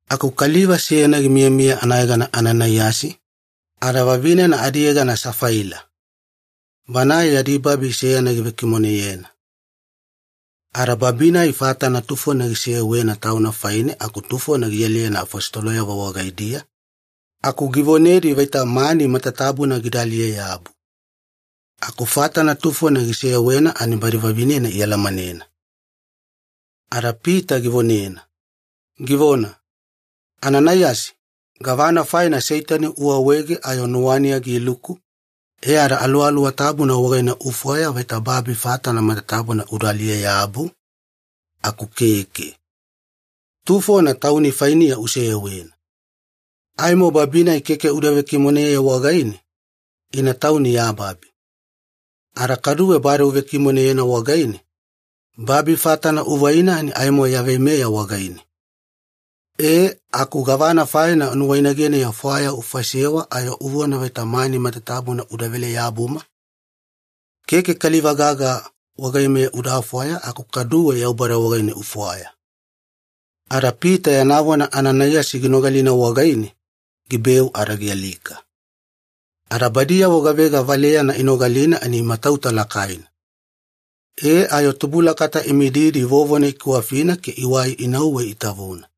Aku kaliva seyana gimiyamiya anayegana Ananaiyasi, ada vavinena adiyegana Safaila. Banae yadi babi seyana givekimoneyena. Ada babi-nai fatana tufona giseyewena tauna faine aku tufona gialiyena afositoloyavo wagaidiya, aku givonedi vaita mani matatabuna gida aliye-yabu. Aku fatana tufona giseyewena ani badi vavinena ialamanena. Ada Pita givonena, givona, “Ananaiyasi, gavana faina Seitani uawaege ayo nuwaniya giluku, e ada Aluwaluwa Tabuna wagaine ufwaya vaita babi fatana matatabuna uda aliye-yabu, aku keke. Tufona tauni fainiya useyewena. Aimo babi-nai keke uda vekimoneye wagaine, ina tauni ya babi. Ada kaduwe bade uvekimoneyena wagaine, babi fatana uvaina ani aimo ya veimeya wagaine. E aku gavana faina nuwainageniya fwaya ufaisewa ayo uvona vaita mani matatabuna udavele-yabuma? Keke kaliva gaga wagaimeya uda fwaya aku kaduwe Yaubada wagaine ufwaya.” Ada Pita yana vona Ananaiyasi ginogalina wagaine, gibeu ada gialika. Ada badiyavo gavega valeyana inogalina ani imatauta lakaina. E ayo tubulakata imididi vovona ikiwafina ke iwai inauwe itavuna.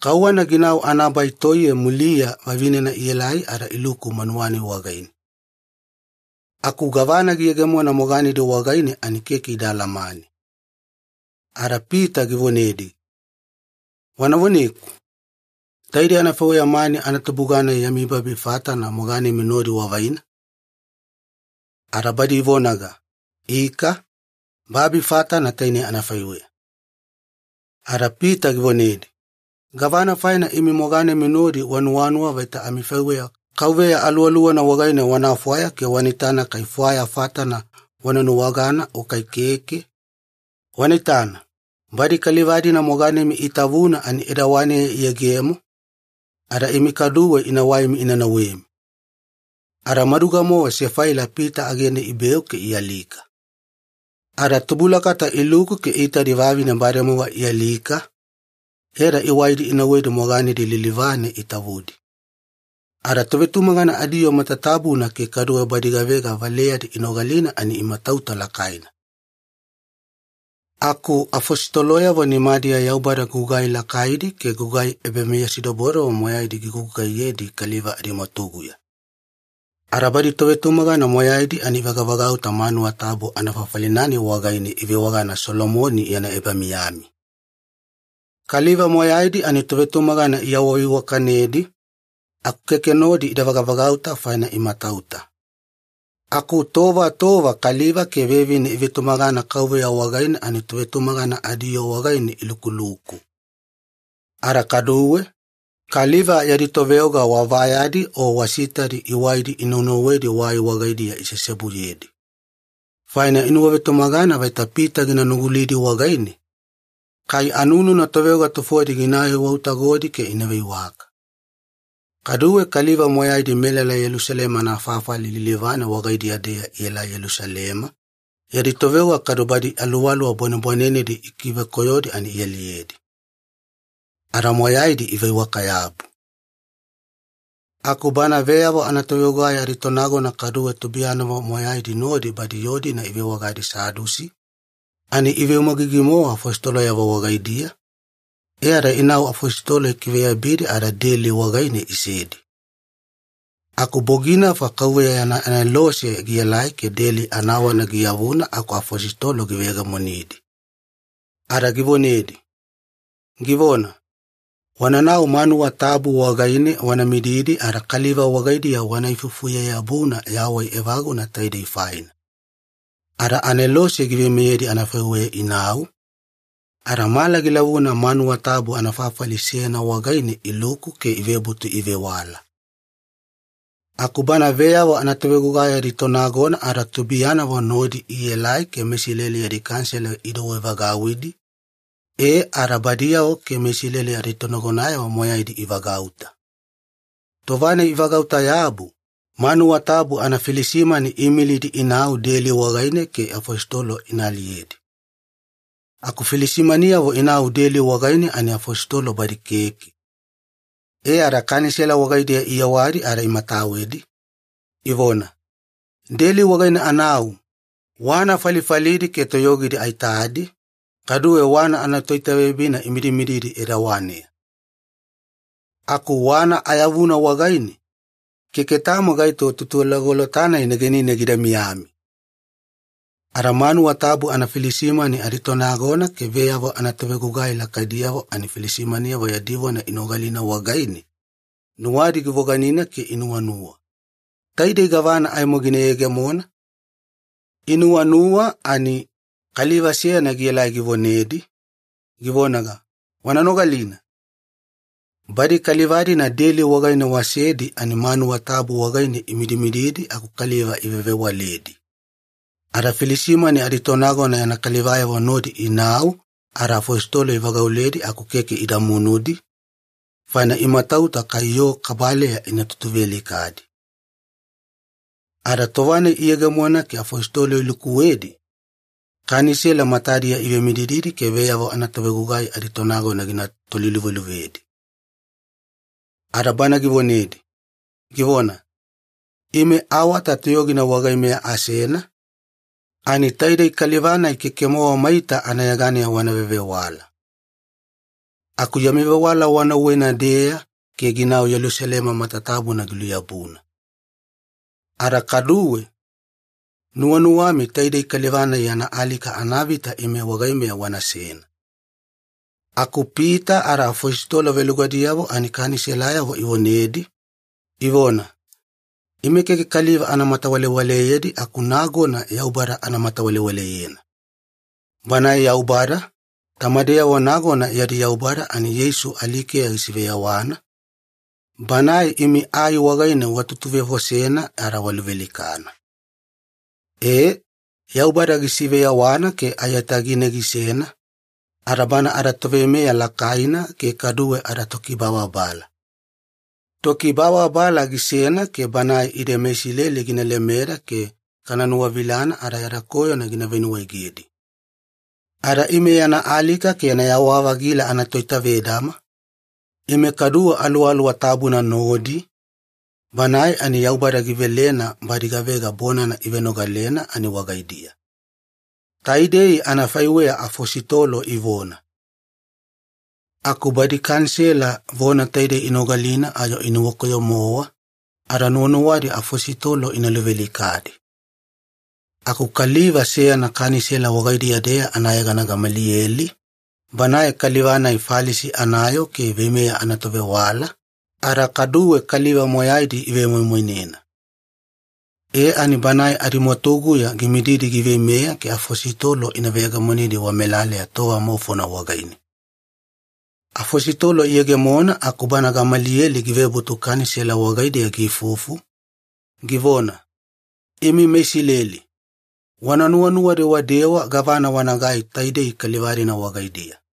Kauwana ginau anabai toiye muliya, vavinena ielai ada iluku manuwa-nai wagaine. Aku gavana giyegemona moganedi wagaine ani keke ida alamane. Ada Pita givonedi, “Wana voneku, taidei anafaiweya mani anatubuga-nai yami babi fatana moganemi nodi wavaina?” Ada badi ivonaga, “Ika, babi fatana tainei anafaiweya.” Ada Pita givonedi, “Gavana faina imi moganemi nodi wanuwanuwa vaita amifaiweya Kauveya Aluwaluwana wagaine wana fwaya ke wana itana kai fwaya fatana wana nuwagana o kai keke? Wana itana, badi kaliva-dina moganemi itavuna ani edawaneya iyegemo, ada imi kaduwe ina waimi ina nauwemi.” Ada maduga-mowa Safaila Pita agene ibeu ke ialika. Ada tubulakata iluku ke iitadi vavine bademowa ialika, e ada iwaidi inauwedi moganedi lilivane itavudi. Ada tovetumagana adiyoo matatabuna ke kaduwe badi gavega valeyadi inogalina ani imatauta lakaina. Aku afositoloyavo nimadiya Yaubada gugai lakaidi ke gugai ebameyasidobodobo moyaidi gigugugaiyedi kaliva adimwatuguya. Ada badi tovetumagana moyaidi ani ivagavagauta manuwa tabu anafafali-nai wagaine ivewagana Solomoni Yana Ebamiyami. Kaliva moyaidi ani tovetumagana iawaveiwakanedi, aku keke nodi ida vagavagauta faina imatauta. Aku tova tova kaliva ke vevine ivetumagana Kauveya wagaine ani tovetumagana adiyoo wagaine ilukuluku. Ada kaduwe, kaliva yadi toveoga wa vayadi o wa sitadi iwaidi inaunauwedi wai wagaidiya iseseobuyedi. Faina inuwavetumagana vaita Pita gina nugulidi wagaine, kai anununa toveoga tufodi gina aiwautagodi ke ina veiwaka. Kaduwe kaliva moyaidi melala Yelusalema anafafali lilivane wagaidiya-deya ielai Yelusalema, yadi toveoga kadu badi aluwaluwa bwanebwanenedi ikivekoyodi ani ialiyedi. Ada moyaidi iveiwaka-yabu. Aku bana veyavo anatovegugai aditonagona kaduwe tubuiyanavo moyaidi nodi badi yoo-dina ivewagadi Sadusi, ani iveumagigi-mowa afositoloyavo wagaidiya, e ada inau afositolo ikiveyabidi ada deli wagaine isedi. Aku boginafa KAUVEYA yana anelose gielai ke deli anawana giyavuna aku afositolo giveyegemonidi. Ada givonedi, givona, “Wananau manuwa tabu wagaine wana mididi ada kaliva wagaidiya wana ifufuye-yabuna yawai evaguna taidei faina.” Ada anelose giveimeyedi anafaiweya inau, ada mala gilavuna manuwa tabu anafafali seyana wagaine iluku ke ivebutu ivewala. Aku bana veyavo anatovegugai aditonagona ada tubuiyanavo nodi ielai ke meIsileli yadi Kanisela idouwevagauwidi, e ada badiyavo ke meIsileli aditonagonayavo moyaidi ivagauta. Tova-nai ivagauta-yabu, manuwa tabu anafilisimani iimilidi inau deli wagaine ke afositolo ina aliyedi. Aku filisimaniyavo inau deli wagaine ani afositolo badi keke. E ada Kanisela wagaidiya iyewadi ada imatawedi, ivona, “Deli wagaine anau, wana falifalidi ke toyogidi aitadi, kaduwe wana anatoitaveyabina imidimididi edawaneya. Aku wana ayavuna wagaine, keke tamo gaito tutulagolota-nai negenine gida miyami!” Ada manuwa tabu anafilisimani aditonagona ke veyavo anatovegugai lakaidiyavo ani filisimaniyavo yadi vona inogalina wagaine, nuwadi givoganina ke inuwanuwa, “Taidei gavana aimo gina yegemona?” Inuwanuwa ani, kaliva seyana giela givonedi, givonaga, “Wana nogalina! Badi kaliva-dina deli wagaine wasedi ani manuwa tabu wagaine imidimididi aku kaliva ivewavewaledi!” Ada filisimani aditonagona yana kalivayavo nodi inau ada afositolo ivagauledi aku keke ida munudi, faina imatauta kai yoo kabaleya ina tutuvealikadi. Ada tova-nai iyegemona ke afositolo ilukuwedi, Kanisela matadiya ivemidididi ke veyavo anatovegugai aditonagona gina toliluveluvedi. Ada bana givonedi, givona, “Ime awata toyogina wagaimiya asena, ani taidei kaliva-nai keke-mowa maita anayeganeya wana vevewala. Aku yami vewala wanauwena-deya ke ginau Yelusalema matatabuna giluyabuna. Ada kaduwe, nuwanuwami taidei kaliva-nai yana alika anavita ime wagaimeya wanasena!” Aku Pita ada afositolo velugadiyavo ani Kaniselayavo ivonedi, ivona, “Ime keke kaliva ana matawalewaleyedi aku nagona Yaubada ana matawalewaleyena. Banae Yaubada, tamadeyavo nagona yadi Yaubada ani Yeisu alikeya gisiveyawana, Banae imi ai wagaine watutuvefosena ada waluvealikana. E, Yaubada gisiveyawana ke aiyatagine gisena, ada bana adaToveimeya Lakaina ke kaduwe adaTokibababala. Tokibababala gisena ke Banae ide meIsileli gina lemeda ke kana nuwavilana ada yada koyona gina venuwaegedi. Ada ime yana alika ke yana yawa-vagila anatoitavedama, ime kaduwe Aluwaluwa Tabuna nodi, Banae ani Yaubada givelena badi gavega bonana ivenogalena ani wagaidiya.” Taidei anafaiweya afositolo ivona. Aku badi Kanisela vona taidei inogalina ayo inuwakoyo-mowa, ada nuwanuwadi afositolo ina luvealikadi. Aku kaliva seyana Kanisela wagaidiya-deya anayegana Gamaliyeli, banae kaliva-nai Falisi anayoo ke veimeya anatovewala, ada kaduwe kaliva moyaidi ivemoimoinena. E ani banae adimwatuguya gimididi giveimeya ke afositolo ina veyegemonidi wamelaleya tova maufona wagaine. Afositolo iyegemona aku bana Gamaliyeli givebutu Kanisela wagaidiya giifufu, givona, “Imi meIsileli, wana nuwanuwa-dewadewa gavana wanagai taidei kaliva-dina wagaidiya.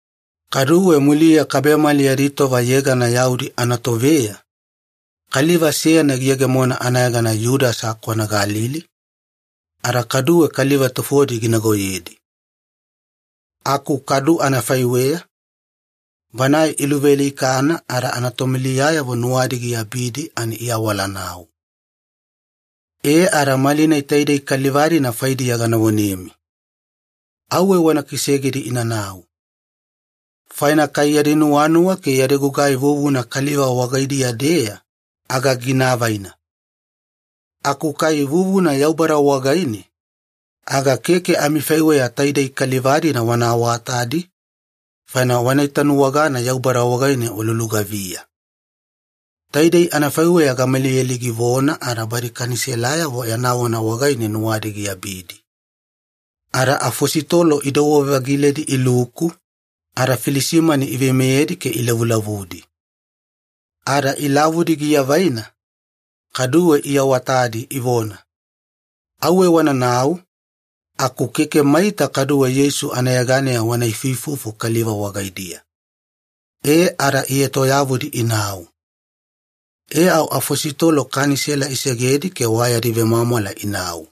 Kaduwe muliya kabemali yadi tova yegana yaudi anatoveya, kaliva seyana giyegemona anayegana Yudasa kwana Galili, ada kaduwe kaliva tufodi ginagoyedi. Aku kadu anafaiweya, banae iluvealikana ada anatomuliyayavo nuwadi giabidi ani iawala inau. E ada malinai taidei kaliva-dina faidiya gana vonemi. Auwe wana kisegedi inanau. Faina kai yadi nuwanuwa ke yadi gugai vuvuna kaliva wagaidiya-deya, aga gina avaina. Aku kai vuvuna Yaubada wagaine, aga keke amifaiweya taidei kaliva-dina wana awatadi, faina wana itanuwagana Yaubada wagaine walulugaviya.” Taidei anafaiweya Gamaliyeli givona ada badi Kaniselayavo yana vona wagaine nuwadi giabidi. Ada afositolo idouwe-vagiledi iluku, ada filisimani iveimeyedi ke ilavulavudi. Ada ilavudi giavaina, kaduwe iawatadi ivona, “Auwe wananau, aku keke maita kaduwe Yeisu anayeganeya wana ifuifufu kaliva wagaidiya.” E ada ietoyavudi inau. E au afositolo Kanisela isegedi ke wa yadi vemwamwala inau.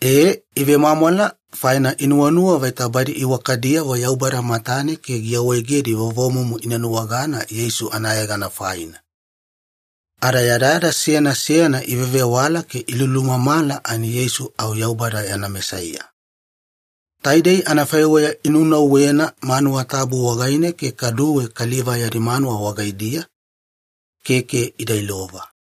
E, ivemwamwala faina inuwanuwa vaita badi iwakadiyavo Yaubada matane ke giawaegedi vovomumu ina nuwagana Yeisu anayegana faina. Ada yadayada seyana seyana ivevewala ke ilulumamala ani Yeisu au Yaubada yana Mesaiya. Taidei anafaiweya inunauwena manuwa tabu wagaine ke kaduwe kaliva yadi manuwa wagaidiya, keke ida ilova.